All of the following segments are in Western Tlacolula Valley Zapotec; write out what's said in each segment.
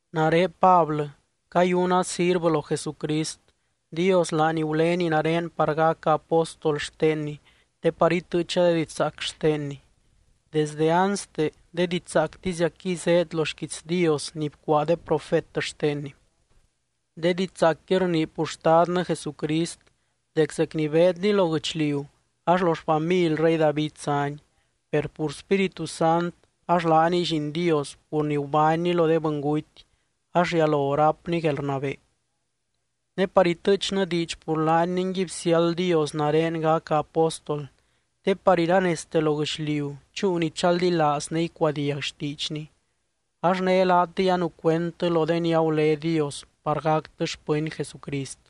Nare Pablɨ, cayuna sirvɨ lo Jesucrist, Dios laany gulény nare par gaca apóstol xtenny te par itɨɨcha de didxzaac xtenny. Desde anste, de didxzaactiziacquiy zéed lo xquiits Dios ni bcuaa de profet xtenny. De didxzaacqui rnii pur Xtadnɨ Jesucrist dec zec ni beedny lo guɨchliu ax lo xfamily rey David zány. Per pur Spíritu Sant ax laaniy Lliin Dios pur ni gubánny lo de bɨnguty ax rialo rápny guelrnabee. Ne par itɨɨchnɨ diidx pur laany ningui bsiáld Dios nare gaca apóstol te par iranezte lo guɨchliu chúu ni chaldilaaz ne icuadiag xtiidxny. Ax né laatɨy anucuendtɨ lo de ni agulé Dios par gactɨ xpɨny Jesucrist.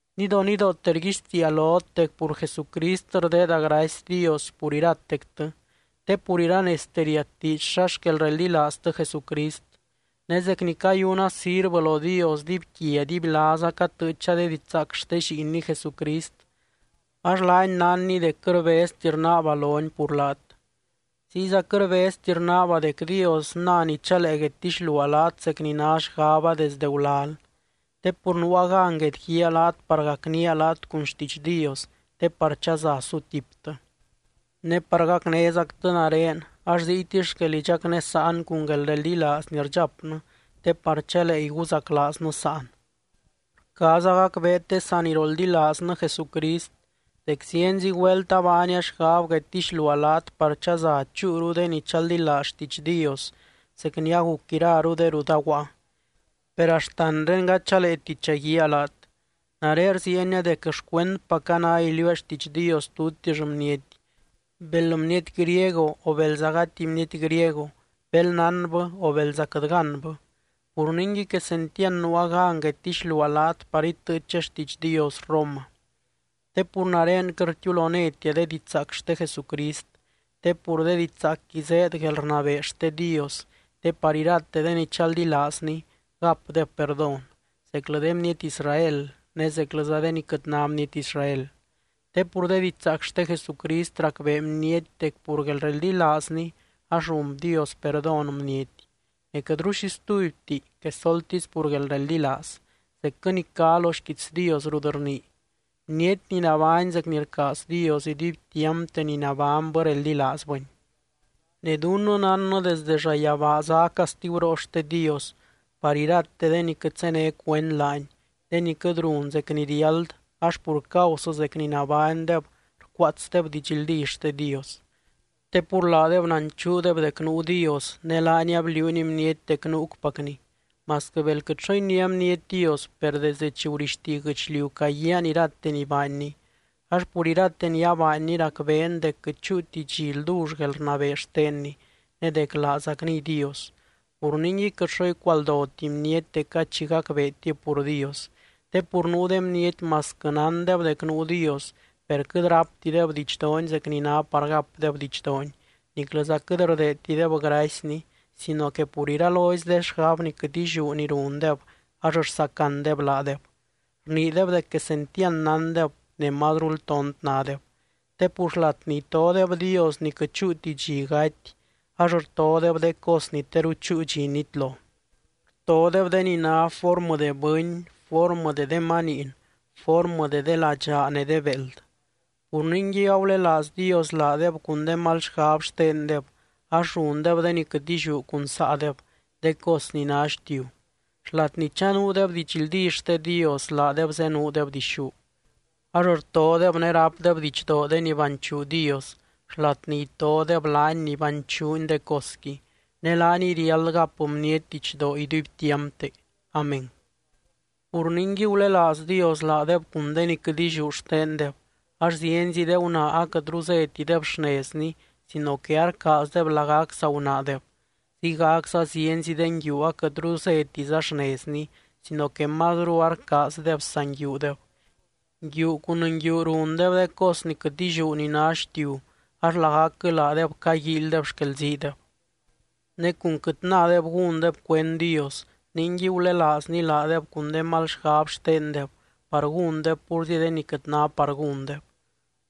Nidonidoote rguixtiia lot dec pur Jesucrist rdeeda gracy Dios pur iratectɨ, te pur iranezte riat diidx xa xquel reldilaaztɨ Jesucrist. Ne zec ni cayuna sirvɨ lo Dios dibyquia dibylaaza catɨɨcha de didxzaac xte Lliinny Jesucrist, ax laany nánny dec quɨt rbezti rnaaba lony pur laat. Ziyza quɨt rbezti rnaaba dec Dios nany chalee guedtixluaa laat zec ni ná xgaba desdɨ gulal. Te pur nuua gan guedguíaa laat par gacnía laat cun xtiidx Dios te par chaza sutiptɨ. Ne par gacnézactɨ nare ax ziytisy xquel idxacnésaan cun guelreldilaaz ni rdxapnɨ te par chalee iguzaclaaznɨ sáan. Rcaaza gacbeet de saniroldilaaznɨ Jesucrist, dec zienzi güelt abaania xgab guedtixluaa laat par chaza chúuru de ni chaldilaaz xtiidx Dios zec ni aguc iraru de rut aguaa, per axtanré gady chaleeti chaguíaa laat. Nare rziienia dec xcuendpaca ná iliuua xtiidx Dios tutix bniety, bel bniety griego o belza gati bniety griego, bel nánbɨ o belza quɨt gánbɨ. Pur ningui quesentiand nuua gan guedtixluaa laat par itɨɨcha xtiidx Dios Roma. Te pur nare quɨt rtiulonétia de didxzaac xte Jesucrist. Te pur de didxzaacqui zéed guelrnabee xte Dios, te par irate de ni chaldilaazni gapdeb perdón, zeclɨ de bniety Israel ne zeclɨza de ni quɨt ná bniety Israel. Te pur de didxzaac xte Jesucrist racbee bniety dec pur guelreldilaazny ax run Dios perdón bniety. Ne quɨtru xi stubyti quesoltisy pur guelreldilaaz, zecquɨ ni cá lo xquiits Dios rut rnii: “Bniety ni nabány zec ni rcaaz Dios, iduibtiampte ni nabánybɨ reldilaazbɨny.” Ne dunnɨ nánnɨ desde llayabaa zá castiguroo xte Dios par irate de ni quɨt zéne cuend laany, de ni quɨt run zec ni riáld ax pur causɨ zec ni nabánydeb rcuaatsdeb didxldí xte Dios. Te pur laadeb nanchuudeb dec nuu Dios ne laany abliuuny bniety dec nuucpacny. Masquɨ bel quɨt xo iniá bniety Dios, per desdɨ chi gurixti guɨchliu caguiaan irate ni baanny, ax pur irate ni abaanny racbeen dec quɨt chúuti dxi ldull guelrnabee xtenny ne dec laazacniy Dios. Pur ningui quɨt xo icualdoti bniety dec gady xi gacbeetib pur Dios. Te pur nuu de bniety masquɨ nándeb dec nuu Dios, per quɨt ráptideb didxdoony zec ni ná par gapdeb didxdoony. Niclɨza quɨt rdeedtideb gracyny sino que pur iralozy de xgab ni quɨt illiú ni rundeb ax rsacandeb laadeb. Rniideb dec quesentiand nándeb ne mazrul tont nádeb. Te pur xlat ni itodeb Dios ni quɨt chúuti dxi gaty ax rtodeb de cos ni teru chúu dxi nitlo, rtodeb de ni ná formɨ de bɨny, formɨ de de maniin, formɨ de de ladxaa ne de béeld. Pur ningui agulelaaz Dios laadeb cun de mal xgab xtendeb ax rundeb de ni quɨt illiú cun saadeb, de cos ni ná xtiu. Xlat ni chanuudeb didxldí xte Dios, laadeb zenuudeb dixú. Ax rtodeb ne rápdeb didxdoo de ni banchuu Dios xlat ni itodeb laany ni banchuuny de cosqui, ne laaniy riáld gap bniety didxdoo iduibtiampte. Amén. Pur ningui, gulelaaz Dios laadeb cun de ni quɨt illiú xtendeb. Ax zienzi de gunaa aquɨtru zétideb xnezni sino que arcaazdeb lagac saa gunaadeb. Ziygacza zienzi de nguiu aquɨtru zétiza xnezni sino que mazru arcaazdeb saa nguiudeb, nguiu cun nguiu rundeb de cos ni quɨt illiú ni ná xtiu, ax lagacquɨ laadeb caguíilydeb xquelziideb. Ne cun quɨt nádeb gúndeb cuend Dios, ningui gulelaazny laadeb cun de mal xgab xtendeb par gúndeb púrzi de ni quɨt ná par gúndeb.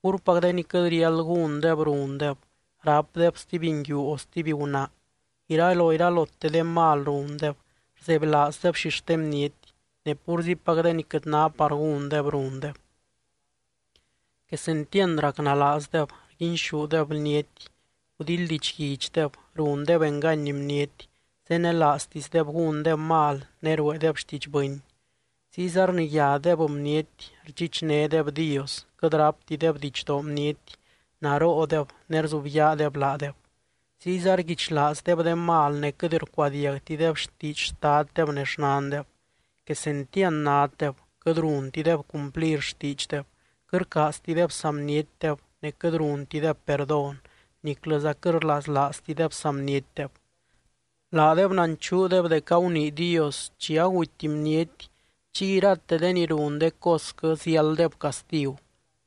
Púrpac de ni quɨt riáld gúndeb rundeb, rápdeb stuby nguiu o stuby gunaa, iraloiralote de mal rundeb, rzebylaazdeb xixte bniety, ne púrzipac de ni quɨt ná par gúndeb rundeb. Quesentiand racnalaazdeb, rguinxúdeb bniety, gudildidxguidxdeb, rundeb engany bniety, zenelaaztisdeb gúndeb mal ne rueedeb xtiidx bɨny. Ziyza rniyádeb bniety, rdxichnédeb Dios, quɨt ráptideb didxdoo bniety, naroodeb ne rzubyaadeb laadeb. Ziyza rguichlaazdeb de mal ne quɨt rcuadiagtideb xtiidx xtaddeb ne xnandeb. Quesentiand naddeb, quɨt runtideb cumplir xtiidxdeb, quɨt rcaaztideb saa bnietdeb, ne quɨt runtideb perdón niclɨza quɨt rlaslaaztideb saa bnietdeb. Laadeb nanchuudeb dec agunii Dios chi aguty bniety, chiy irate de ni run de cosquɨ ziálddeb castigu.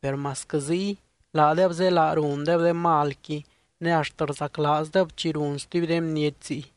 Per masquɨ ziy, laadeb zélaa rundeb de malqui ne axt rzaclaazdeb chi run stuby de bniety ziy.